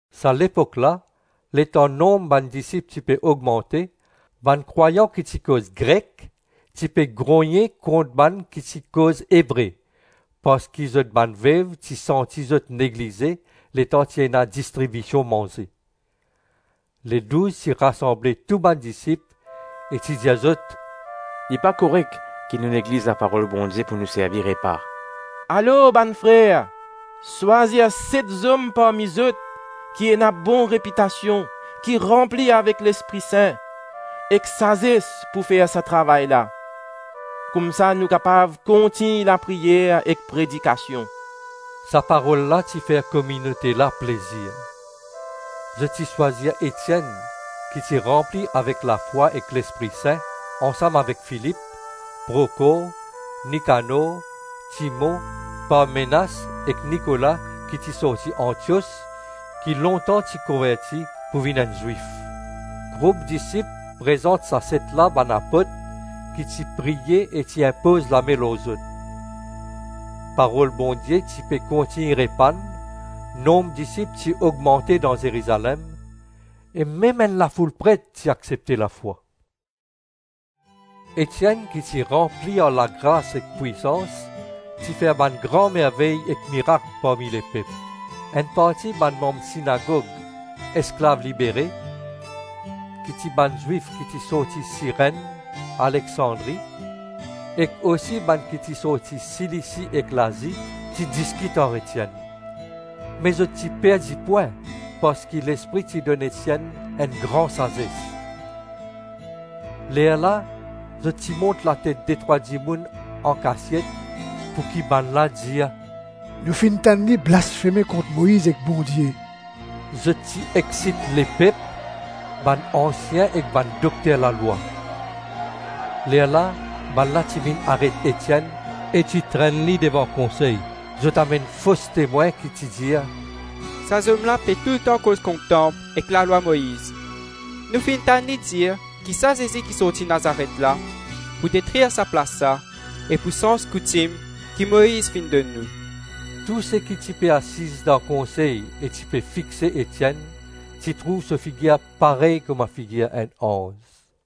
Sa lepok la, letan nonb bann disip ti pe ogmante, bann krwayan ki ti koz Grek ti pe grogne kont bann ki ti koz Ebre parski zot bann vev ti santi zot neglize letan ti ena distribision manze. Ledouz ti rasanble tou bann disip e ti dir zot, “Li pa korek ki nou negliz laparol Bondie pou nou servi repa. Alors, bann frer, swazir set zom parmi zot ki ena bon repitasion, ki ranpli avek Lespri Sin ek sazes pou fer sa travay la. Koumsa nou kapav kontign lapriyer ek predikasion.” Sa parol la ti fer kominote la plezir. Zot ti swazir Etienn ki ti ranpli avek lafwa ek Lespri Sin, ansam avek Filip, Prokor, Nikanor, Timon, Parmenas, ek Nikola ki ti sorti Antios, ki lontan ti konverti pou vinn enn Zwif. Group disip prezant sa set la bann apot, ki ti priye e ti inpoz lame lor zot. Parol Bondie ti pe kontign repann; nonb disip ti ogmante dan Zerizalem, e mem enn lafoul pret ti aksepte lafwa. Etienn ki ti ranpli ar lagras ek pwisans, ti fer bann gran mervey ek mirak parmi lepep. Enn parti bann manm sinagog Esklav Libere, ki ti bann Zwif ki ti sorti Sirenn, Aleksandri, ek osi bann ki ti sorti Silisi e Lazi, ti diskit ar Etienn. Me zot ti perdi pwin parski Lespri ti donn Etienn enn gran sazes. Lerla zot ti mont latet detrwa dimoun ankasiet pouki bannla dir, “Nou finn tann li blasfeme kont Moiz ek Bondie.” Zot ti eksit lepep, bann ansien ek bann dokter lalwa; lerla bannla ti vinn aret Etienn, e ti trenn li devan konsey. Zot amenn fos temwin ki ti dir, “Sa zom la pe toultan koz kont tanp ek lalwa Moiz. Nou finn tann li dir ki sa Zezi ki sorti Nazaret la, pou detrir sa plas la e pou sanz koutim ki Moiz finn donn nou.” Tou seki ti pe asiz dan konsey e ti pe fixe Etienn, ti trouv so figir parey kouma figir enn anz.